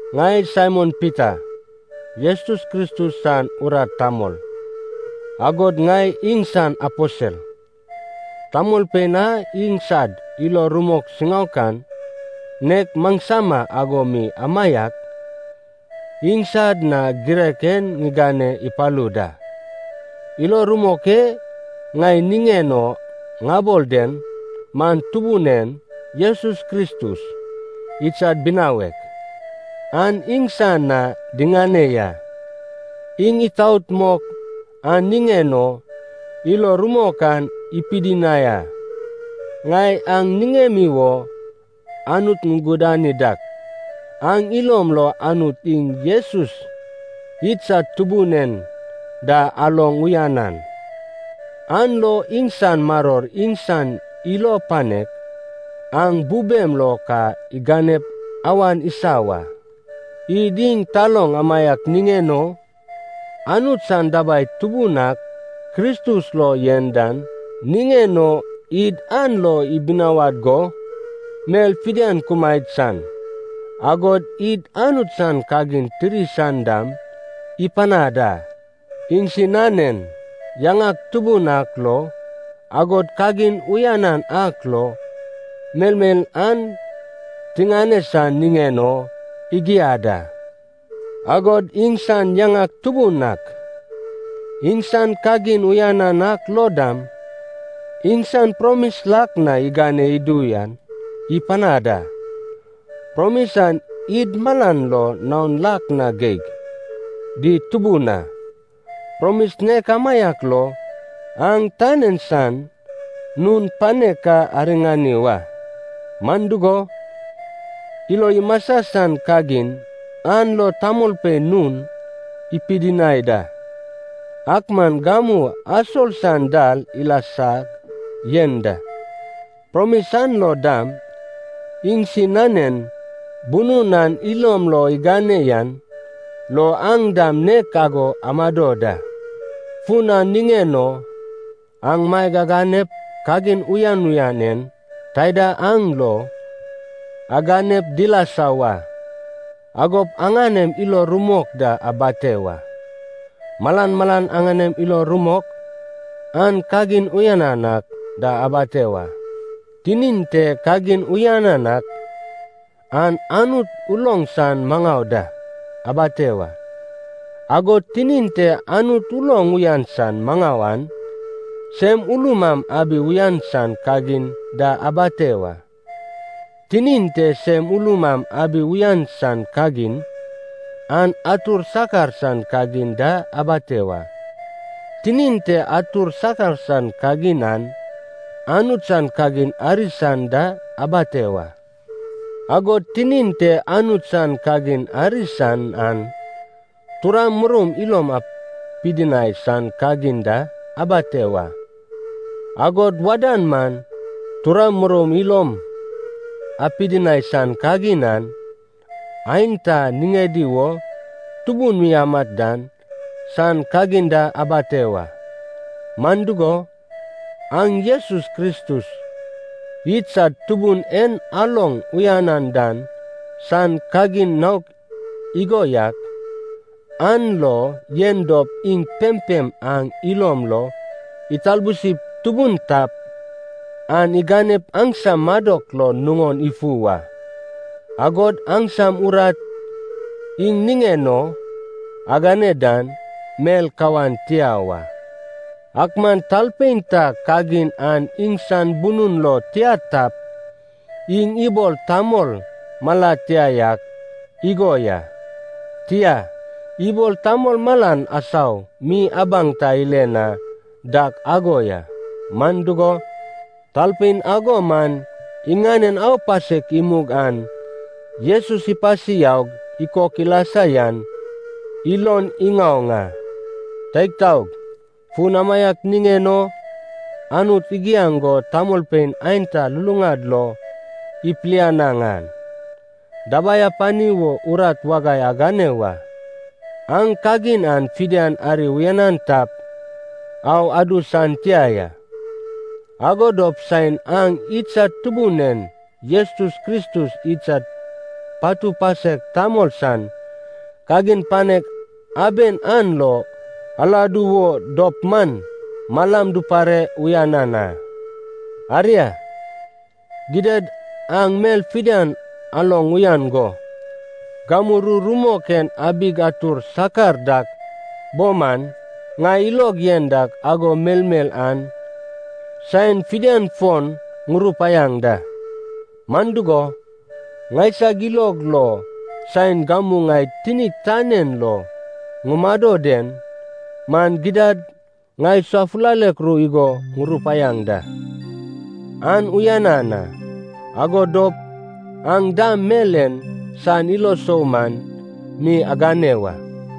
Ŋai Saimon Pita, Jesus Kristus san urat tamol agod ŋai iŋsan aposel. Tamolpein a iŋsad ilo rumok siŋaokan, nek maŋsama ago mi amaiak, iŋsad na girek en ŋigane ipalu da. Ilo rumok e ŋai niŋen o ŋabol den man Tubun en Jesus Kristus, idsad binawek, an iŋsan na diŋane ya. Iŋ itaot mok an niŋen o ilo rumok an ipidinai a. Ŋai aŋ niŋemi wo Anut ŋugudani dak, aŋ ilom lo Anut iŋ Jesus idsad Tubun en da aloŋ uyanan, an lo iŋsan maror iŋsan ilo panek aŋ bubem lo ka iganep awan isa wa. Id iŋ taloŋ amaiak niŋen o, Anut san dabai tubun ak Kristus lo yen dan niŋen o, id an lo ibinawad go mel fidian kumaed san, agod id Anut san kagin tiri san dam ipanad a. Iŋsinanen yaŋak tubun ak lo agod kagin uyanan ak lo melmel an tiŋane san niŋen o igiad a. Agod iŋsan yaŋak tubun ak, iŋsan kagin uyanan ak lo dam, iŋsan promis lak na igane idu yan ipanad a. Promis an id malad lo naon lak na geig di tubun a. Promis nek amaiak lo aŋ tan en san nun panek ka ariŋani wa, man dugo, ilo imasa san kagin an lo tamolpein nun ipidinai da, ak man gamu asol san dal ilasag yen da. Promis an lo dam, iŋsinanen bunun aŋ ilom lo igane yan lo aŋ dam nek ago amado da. Fun an niŋen o aŋ maeg aganep kagin uyan uyan en taida aŋ lo aganep dilasa wa, agop aŋanem ilo rumok da abate wa. Malan malan aŋanem ilo rumok, an kagin uyanan ak da abate wa. Tinin te kagin uyanan ak, an Anut uloŋ san maŋau da abate wa. Agod tinin te Anut uloŋ uyan san maŋau aŋ sem ulum am abi uyan san kagin da abate wa. Tinin te sem ulum am abi uyan san kagin, an atur sakar san kagin da abate wa. Tinin te atur sakar san kagin an, Anut san kagin ari san da abate wa. Agod tinin te Anut san kagin ari san an, turam muroum ilom apidinai san kagin da abate wa. Agod wadan man turam muroum ilom apidinai san kagin an, aenta niŋedi wo tubun mi amat dan san kagin da abate wa. Man dugo, aŋ Jesus Kristus idsad Tubun en aloŋ uyanan dan san kagin naok igo yak aŋ lo yen dop, iŋ pempem aŋ ilom lo italbusip tubun tap, an iganep aŋsam madok lo nuŋon ifu wa, agod aŋsam urat iŋ niŋen o agane dan mel kawan tia wa. Ak man talpein ta kagin an iŋsan bunun lo tia tap, iŋ ibol tamol mala tia yak igo ya, tia, ibol tamol malan asau mi abaŋ ta ile na dak ago ya. Man dugo, talpein ago man iŋanen aupasek imug an Jesus ipasi yaug ikok ilasa yan ilon iŋaoŋ a. Teig taog, fun amaiak niŋen o Anut igiaŋ go tamolpein aenta luluŋad lo ipilianaŋ an, dabai apani wo urat wagai agane wa. Aŋ kagin an fidian ari uyanan tap, au adu san tia ya. Ago dop saen aŋ idsad Tubun en Jesus Kristus idsad patu pasek tamol san kagin panek aben an lo aladu wo dop man, malam dupare uyanan a. Aria, gidad aŋ mel fidian aloŋ uyan go, gamu ru rumok en abig atur sakar dak bo man, ŋai ilog yen dak ago melmel an saen fidian fon ŋurupaiaŋ da. Man dugo, ŋaisag ilog lo saen gamu ŋai tinig tan en lo ŋumado den man gidad ŋai safulalek ru igo ŋurupaiaŋ da, an uyanan a. Ago dop aŋ dam mel en san ilo sou man mi agane wa.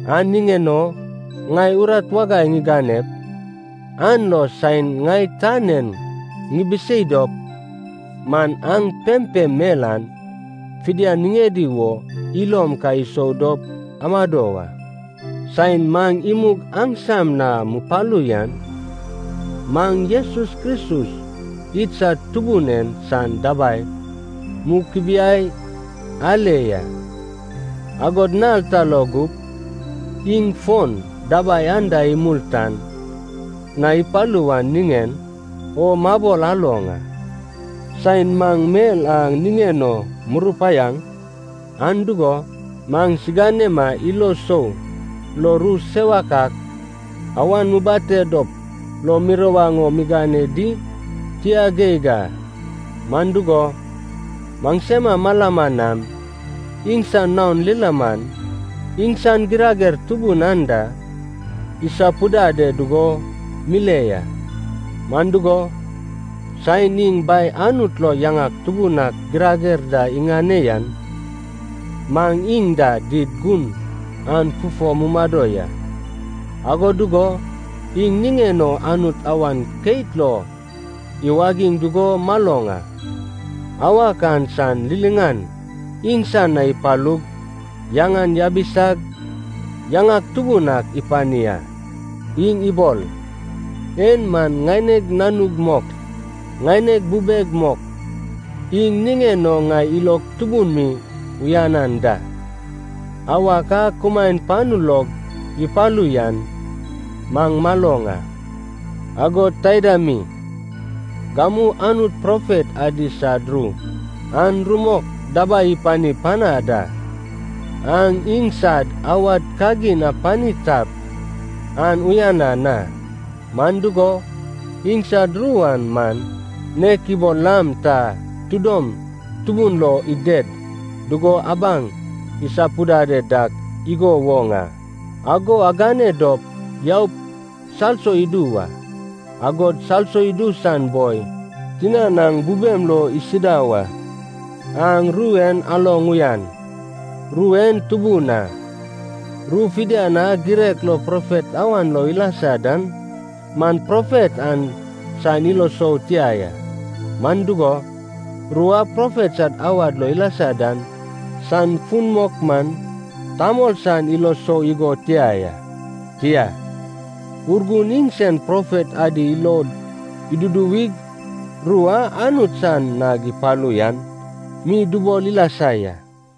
An niŋen o ŋai urat wagai ŋiganep an lo saen ŋai tan en ŋibisei dop man, aŋ pempem mel an fidian niŋedi wo ilom ka isou dop amado wa. Saen maŋ imug aŋsam na mupalu yan, maŋ Jesus Kristus idsad Tubun en san dabai mukubiai ale ya. Agod nal ta lo gup iŋ fon dabai anda imul tan na ipalu wan niŋen o mabol aloŋ a. Saen maŋ mel a niŋen o murupaiaŋ an dugo, maŋsiganema ilo sou lo ru sewak ak awan mubate dop lo mirawaŋ o migane di? Tia geig a, man dugo, maŋsema malama nam iŋsan naon lilaman, iŋsan girager tubun an da isapudade dugo mile ya. Man dugo, saen iŋ Bai Anut lo yaŋak tubun ak girager da iŋane yan, maŋ iŋ da did gun an fufo mumado ya, ago dugo iŋ niŋen o Anut awan keit lo iwagiŋ dugo maloŋ a. Awak an san liliŋan iŋsan na ipalug yaŋan yabisag yaŋak tubun ak ipani a. Iŋ ibol, “En man ŋaineg Nanug mok, ŋaineg bubeg mok, iŋ niŋen o ŋai ilog tubun mi uyanan da.” Awak a kumaen panu log ipalu yan maŋ maloŋ a. Agod taida mi, gamu Anut profet adi sad ru an rumok dabai ipani panad a. Aŋ iŋsad awad kagin apani tap, an uyanan a. Man dugo, iŋsad ru an man nek ibol lam ta tidom tubun lo ided dugo abaŋ isapudade dak igo woŋ a. Ago agane dop yaup salso idu wa, agod salso idu san boi tinan aŋ bubem lo isida wa. Aŋ ru en aloŋ uyan, ru en tubun a. Ru fidian a girek lo profet awan lo ilasa dan man, profet an san ilo sou tia ya. Man dugo, ru a profet sad awad lo ilasa dan san fun mok man, tamol san ilo sou igo tia ya. Tia, Urgun iŋsen profet adi ilod iduduwig ru a Anut san nag ipalu yan mi dubol ilasa ya.